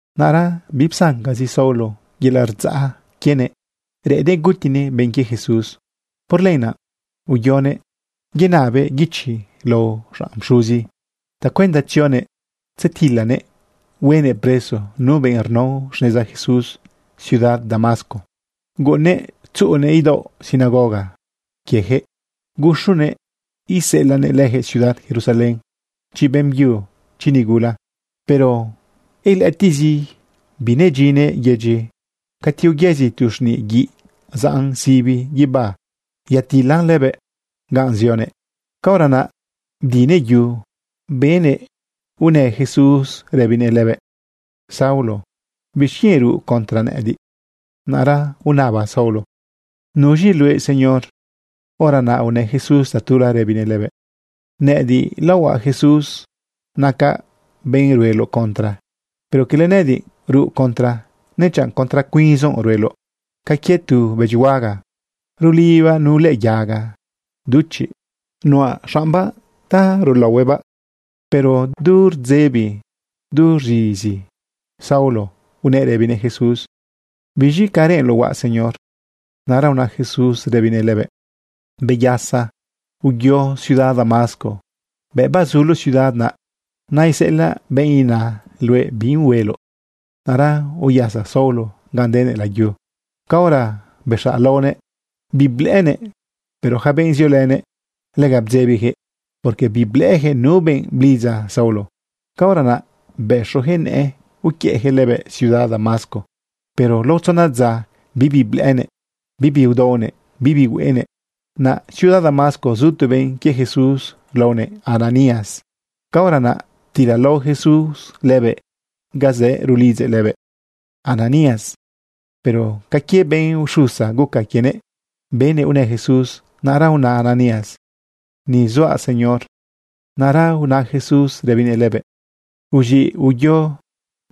Naꞌra bipsancazi Saulo yelaꞌ rdzaꞌ quienëꞌ reꞌennëꞌ gutinëꞌ benꞌ quie Jesús. Por lenaꞌ uyonëꞌ yanabëꞌ guichi lao xanꞌ pxuzi tacuenda tzionëꞌ tzedilanëꞌ huenëꞌ preso nu benꞌ rnao xneza Jesús ciudad Damasco. Guꞌunnëꞌ tzuꞌunëꞌ idaoꞌ sinagoga quieyaquëꞌ guxonëꞌ iseꞌelaꞌnëꞌ leyaquëꞌ ciudad Jerusalén, chi beꞌmbyu, chi nigula. Pero ilëꞌëtiꞌzi binedyinnëꞌ yedyi, cati uyëzi tu xniꞌ guiꞌ zaꞌn sibi guibá yatilan lëbëꞌ ga zionëꞌ. Caora naꞌ bdinëꞌ yu, benëꞌ unë Jesús rëbinëꞌ lëbëꞌ: ―Saulo, ¿bixquienꞌ ruꞌ contra nëꞌëdiꞌ? Naꞌra unaba Saulo: ―¿Nuz̃i luëꞌ, Señor? Hora naꞌ unë Jesús tatula, rëbinëꞌ lëbëꞌ: ―Nëꞌëdiꞌ laohuaꞌ Jesús. Nacaꞌ benꞌ rueloꞌ contra. Pero cala nëꞌëdiꞌ ruꞌ contra, nechanꞌ contra cuinzoꞌ rueloꞌ ca quie tu bëdyi huaga rulibibaꞌ nu lëꞌë yaga duchiꞌ nuꞌa xaꞌmbaꞌ ta rulaohuëꞌbaꞌ. Pero du rdzebi, du rz̃izi Saulo, unëꞌ rëbinëꞌ Jesús: ―¿Biz̃i ca reꞌenloꞌ huaꞌ, Señor? Naꞌra una Jesús, rëbinëꞌ lëbëꞌ: ―Beyasa, uyo ciudad Damasco. Bëꞌ bazuloꞌ ciudad naꞌ, naiseꞌelaꞌ benꞌ ina luëꞌ bi hueloꞌ. Naꞌra uyasa Saulo gan denëꞌ layu. Caora bexaꞌ laonëꞌ, biblëꞌënëꞌ. Pero yaca benꞌ ziolënëꞌ, lega bdzebiyaquëꞌ, porque biblëꞌëyaquëꞌ nu benꞌ blidza Saulo. Caora naꞌ bëxoyaquëꞌ nëꞌë uquiëꞌyaquëꞌ lëbëꞌ ciudad Damasco, pero lao tzona dza bibi blëꞌënëꞌ, bibi udaonëꞌ, bibi hueꞌenëꞌ. Naꞌ ciudad Damasco zu tu benꞌ quie Jesús laonëꞌ Ananías. Caora naꞌ ptilalao Jesús lëbëꞌ ga zëꞌ rulidzëꞌ lëbëꞌ: ―Ananías. Pero ca quie benꞌ uxusa guca quienëꞌ benëꞌ unë Jesús. Naꞌra una Ananías: ―Ni zuaꞌ, Señor. Naꞌra una Jesús rëbinëꞌ lëbëꞌ: ―Uz̃iꞌ, uyo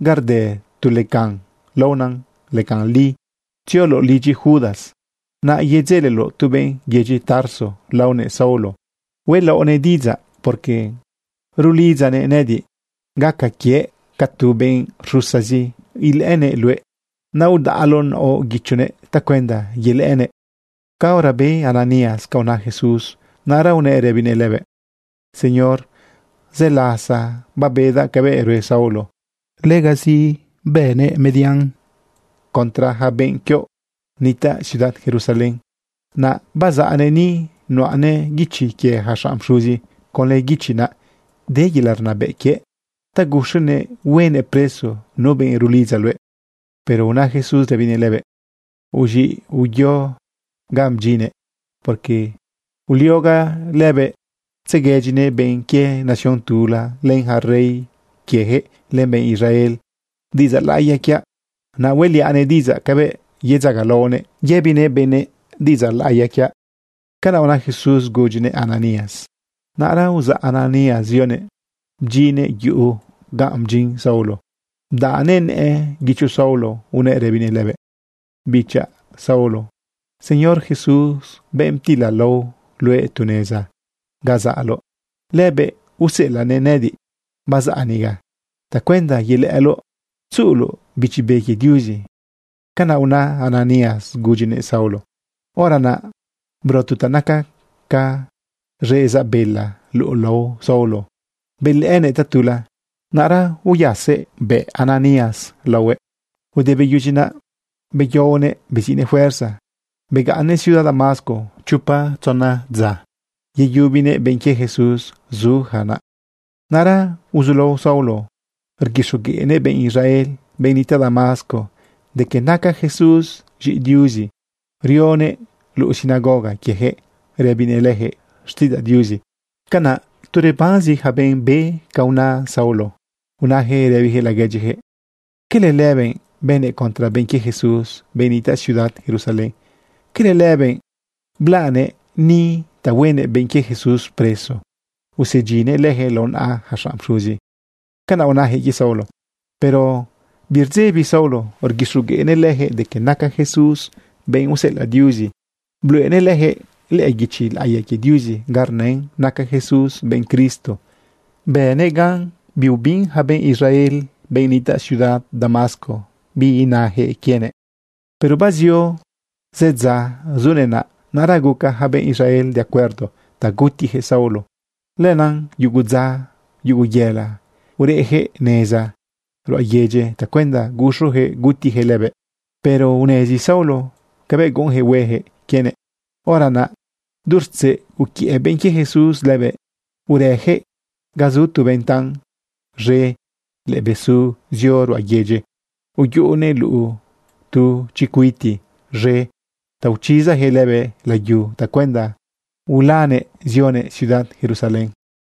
ga rde tu lecan laona lecan li. Tzioloꞌ lidyi Judas, naꞌ yedzeleloꞌ tu benꞌ yedyi Tarso laonëꞌ Saulo. Huelaoꞌnëꞌ diꞌidzaꞌ, porque rulidzanëꞌ nëꞌëdiꞌ. Gaca quiëꞌ ca tu benꞌ rxusazi ilëꞌënëꞌ luëꞌ. Naꞌ udaꞌloꞌ naoꞌ guichonëꞌ tacuenda yelëꞌënëꞌ. Caora be Ananías ca una Jesús, naꞌra unëꞌ rëbinëꞌ lëbëꞌ: ―Señor, zë lasa babedaꞌ cabëꞌ rue Saulo. Legazi bënëꞌ median contra yaca benꞌ quioꞌ nitaꞌ ciudad Jerusalén. Naꞌ bazaꞌnëꞌ ni, nuꞌanëꞌ guichi quie yaca xanꞌ pxuzi. Conlë guichi naꞌ de yelaꞌ rnabëꞌ quiëꞌ ta guxonëꞌ huenëꞌ preso nu benꞌ rulidza luëꞌ. Pero una Jesús, rëbinëꞌ lëbëꞌ: ―Uz̃iꞌ, uyo ga bdyinnëꞌ, porque uliogaꞌ lëbëꞌ tzeguedyinëꞌ benꞌ quie nación tula, len yaca rey quieyaquëꞌ, len benꞌ Israel diꞌidzaꞌ laꞌiya quiaꞌ. Naꞌ hueꞌliaꞌnëꞌ diꞌidzaꞌ cabëꞌ yedzagalaonëꞌ yëbinëꞌ benëꞌ diꞌidzaꞌ laꞌiya quiaꞌ. ―Canaꞌ una Jesús gudyinëꞌ Ananías. Naꞌra uzaꞌ Ananías zionëꞌ bdyinnëꞌ yuꞌu ga bdyin Saulo, bdaꞌnëꞌ nëꞌë guicho Saulo, unëꞌ rëbinëꞌ lëbëꞌ: ―Bichaꞌ Saulo, Señor Jesús, benꞌ ptilalao luëꞌ tu neza ga zaꞌloꞌ, lëbëꞌ useꞌelaꞌnëꞌ nëꞌëdiꞌ bazaꞌ niga tacuenda yelëꞌëloꞌ tzuꞌuloꞌ Bichi Be quie Diuzi. ―Canaꞌ una Ananías gudyinëꞌ Saulo. Hora naꞌ bro tu ta naca ca z̃ezaꞌ bela luꞌu lao Saulo belëꞌënëꞌ tatula. Naꞌra uyasëꞌ bëꞌ Ananías lëbëꞌ laohuëꞌ. Ude beyudyi naꞌ beyaonëꞌ beziꞌnëꞌ fuerza, begaꞌnnëꞌ ciudad Damasco chopa tzona dza yeyubinëꞌ benꞌ quie Jesús zuyaca naꞌ. Naꞌra uzulao Saulo rguixogueꞌnëꞌ benꞌ Israel, benꞌ nitaꞌ Damasco de que naca Jesús z̃iꞌi Diuzi. Rionëꞌ luꞌu sinagoga quieyaquëꞌ rëbinëꞌ leyaquëꞌ xtiꞌidzaꞌ Diuzi. Canaꞌ tu rebanzi yaca benꞌ be ca una Saulo, unayaquëꞌ rëbiyaquëꞌ laguedyijëꞌ: ―¿Cala lëbëꞌ bënëꞌ contra benꞌ quie Jesús, benꞌ nitaꞌ ciudad Jerusalén? ¿Cala lëbëꞌ blaꞌnëꞌ ni ta huenëꞌ benꞌ quie Jesús preso, usedyinnëꞌ leyaquëꞌ lao naꞌa yaca xanꞌ pxuzi? ―Canaꞌ unayaquëꞌ quie Saulo. Pero birdzebi Saulo rguixogueꞌnëꞌ leyaquëꞌ de que naca Jesús benꞌ useꞌelaꞌ Diuzi. Bluꞌenëꞌ leyaquëꞌ lëꞌë guichi laꞌiya quie Diuzi ga rnën naca Jesús benꞌ Cristo. Bënëꞌ gan biubin yaca benꞌ Israel, benꞌ nitaꞌ ciudad Damasco, bi inayaquëꞌ quienëꞌ. Pero bazio zë dza zunëꞌ naꞌ, naꞌra guca yaca benꞌ Israel de acuerdo ta gutiyaquëꞌ Saulo. Lenaꞌ yugu dza, yugu yela, ureꞌyaquëꞌ neza ruꞌa yedyi tacuenda guxoyaquëꞌ gutiyaquëꞌ lëbëꞌ. Pero unezi Saulo cabëꞌ guꞌunyaquëꞌ hueyaquëꞌ quienëꞌ. Hora naꞌ du rtzeꞌ, uquiëꞌ benꞌ quie Jesús lëbëꞌ, urëyaquëꞌ ga zu tu ventan z̃e lëꞌë besu zio ruꞌa yedyi, uyuꞌunëꞌ luꞌu tu chicuiti z̃e ta uchizayaquëꞌ lëbëꞌ layu tacuenda ulanëꞌ zionëꞌ ciudad Jerusalén.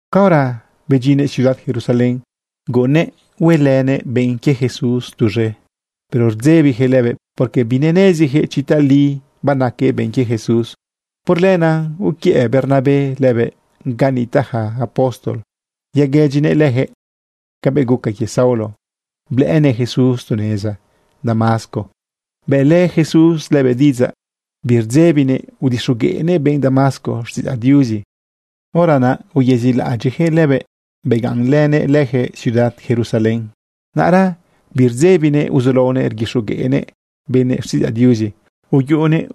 Caora bedyinnëꞌ ciudad Jerusalén guꞌunnëꞌ huelënëꞌ benꞌ quie Jesús tuz̃e. Pero rdzebiyaquëꞌ lëbëꞌ, porque bineneziyaquëꞌ chi tali banaquëꞌ benꞌ quie Jesús. Por lenaꞌ uquiëꞌ Bernabé lëbëꞌ ga nitaꞌ ja apóstol yaguëdyinëꞌ leyaquëꞌ cabëꞌ guca quie Saulo blëꞌënëꞌ Jesús tu neza Damasco, bëꞌlë Jesús lëbëꞌ diꞌidzaꞌ, birdzebinëꞌ udixogueꞌnëꞌ benꞌ Damasco xtiꞌidzaꞌ Diuzi. Hora naꞌ uyezilaꞌadyiꞌyaquëꞌ lëbëꞌ begaꞌnlënëꞌ leyaquëꞌ ciudad Jerusalén. Naꞌra birdzebinëꞌ uzulaonëꞌ rguixogueꞌnëꞌ benëꞌ xtiꞌidzaꞌ Diuzi. Uyuꞌunëꞌ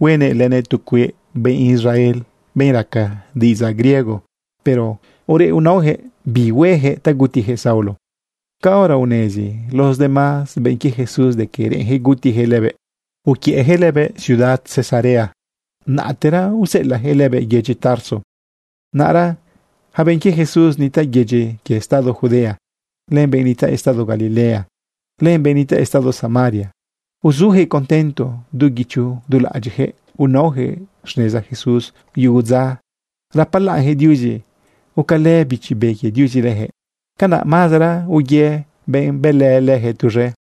huenë lënëꞌ tu cueꞌ benꞌ Israel, benꞌ raca diꞌidzaꞌ griego, pero ureꞌ unaoyaquëꞌ bi hueyaquëꞌ ta gutiyaquëꞌ Saulo. Caora unezi los demás benꞌ quie Jesús de que reꞌenyaquëꞌ gutiyaquëꞌ lëbëꞌ, uquiëꞌyaquëꞌ lëbëꞌ ciudad Cesarea, naꞌtera useꞌelaꞌyaquëꞌ lëbëꞌ yedyi Tarso. Naꞌra ja benꞌ quie Jesús nitaꞌ yedyi quie estado Judea, len benꞌ nitaꞌ estado Galilea, len benꞌ nitaꞌ estado Samaria, uzujëꞌ contento. Du guicho du laꞌadyiꞌjëꞌ unaojëꞌ xneza Jesús. Yugu dza rapalaꞌnyaquëꞌ Diuzi gucalë Bichi Be quie Diuzi leyaquëꞌ. Canaꞌ mazera uye benꞌ bëlë leyaquëꞌ tuz̃e.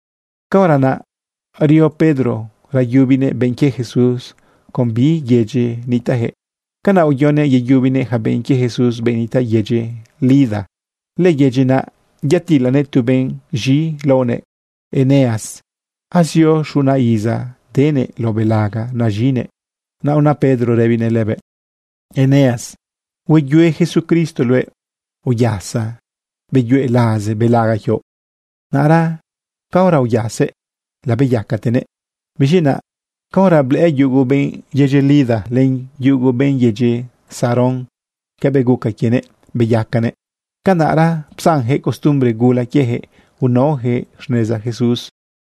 Caora naꞌ rio Pedro rayubinëꞌ benꞌ quie Jesús con bi yedyi nitaꞌyaquëꞌ. Canaꞌ uyonëꞌ yeyubinëꞌ yaca benꞌ quie Jesús, benꞌ nitaꞌ yedyi Lida. Lëyedyi naꞌ yatilanëꞌ tu benꞌ z̃i laonëꞌ Eneas. Azio xuna iza denëꞌ lao belaga naz̃inëꞌ. Naꞌ una Pedro rëbinëꞌ lëbëꞌ: ―¡Eneas, hueyue Jesucristo luëꞌ! ¡Uyasa, beyue laze belaga quioꞌ! Naꞌra caora uyasëꞌ, labeyacatenëꞌ. Biz̃i naꞌ caora blëꞌë yugo benꞌ yedyi Lida len yugo benꞌ yedyi Sarón cabëꞌ guca quienëꞌ beyacanëꞌ, canaꞌra psanyaquëꞌ costumbre gula quieyaquëꞌ unaoyaquëꞌ xneza Jesús.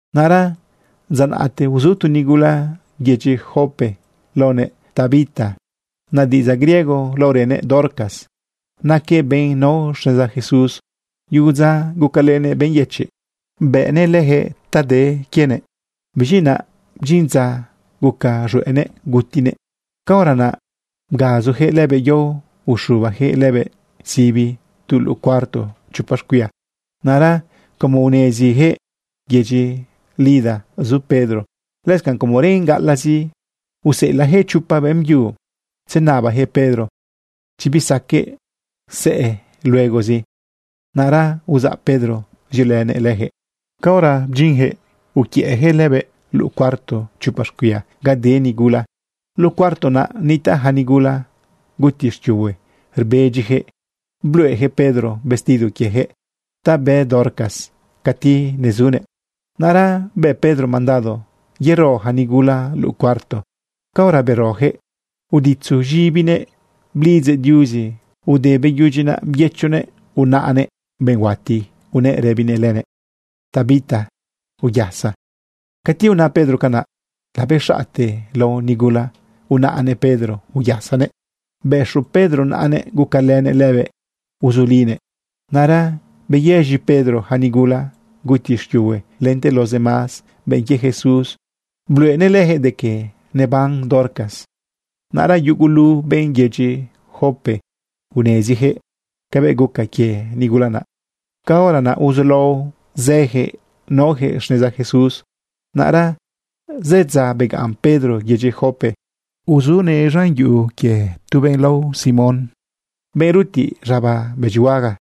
Naꞌra dza naꞌte uzu tu nigula yedyi Jope laonëꞌ Tabita. Naꞌ diꞌidzaꞌ griego laorënëꞌ Dorcas. Naquëꞌ benꞌ nao xneza Jesús. Yugu dza gucalënëꞌ benꞌ yëchiꞌ, bëꞌnëꞌ leyaquëꞌ ta de quienëꞌ. Biz̃i naꞌ bdyin dza guca z̃hueꞌnëꞌ gutinëꞌ. Caora naꞌ bgazujëꞌ lëbëꞌ yao uxubayaquëꞌ lëbëꞌ sibi tu luꞌu cuarto chopa xcuia. Naꞌra como uneziyaquëꞌ yedyi Lida zu Pedro, lëscanꞌ como reꞌn gaꞌalaꞌzi, useꞌelaꞌjëꞌ chopa beꞌmbyu tzenabayaquëꞌ Pedro, chi bisaqueꞌ sëꞌë luegozi. Naꞌra uzaꞌ Pedro ziolënëꞌ leyaquëꞌ. Caora bedyinyaquëꞌ uquiëꞌyaquëꞌ lëbëꞌ luꞌu cuarto chopa xcuia ga de nigula. Luꞌu cuarto naꞌ nitaꞌ ja nigula guti xquiuhue rbedyiyaquëꞌ, bluꞌeyaquëꞌ Pedro vestido quieyaquëꞌ ta bë Dorcas cati nezunëꞌ. Naꞌra bë Pedro mandado yero ja nigula luꞌu cuarto. Caora beroyaquëꞌ, uditzu z̃ibinëꞌ blidzëꞌ Diuzi. Ude beyudyi naꞌ, byëchunëꞌ unaꞌnëꞌ benꞌ huati, unëꞌ rëbinëꞌ lënëꞌ: ―Tabita, uyasa. Cati una Pedro canaꞌ, labez̃aꞌte lao nigula, unaꞌnëꞌ Pedro uyasanëꞌ. Bëxu Pedro naꞌanëꞌ gucalënëꞌ lëbëꞌ uzulinëꞌ. Naꞌra beyëz̃i Pedro yaca nigula guti xquiuhue lente los demás benꞌ quie Jesús. Bluꞌenëꞌ leyaquëꞌ de que neban Dorcas. Naꞌra yugulu benꞌ yedyi Jope uneziyaquëꞌ cabëꞌ guca quie nigula naꞌ. Caora naꞌ uzulao zëyaquëꞌ naoyaquëꞌ xneza Jesús. Naꞌra zë dza begaꞌn Pedro yedyi Jope. Uzunëꞌ lidyi tu benꞌ lao Simón, benꞌ rutiꞌ z̃aba bëdyihuaga.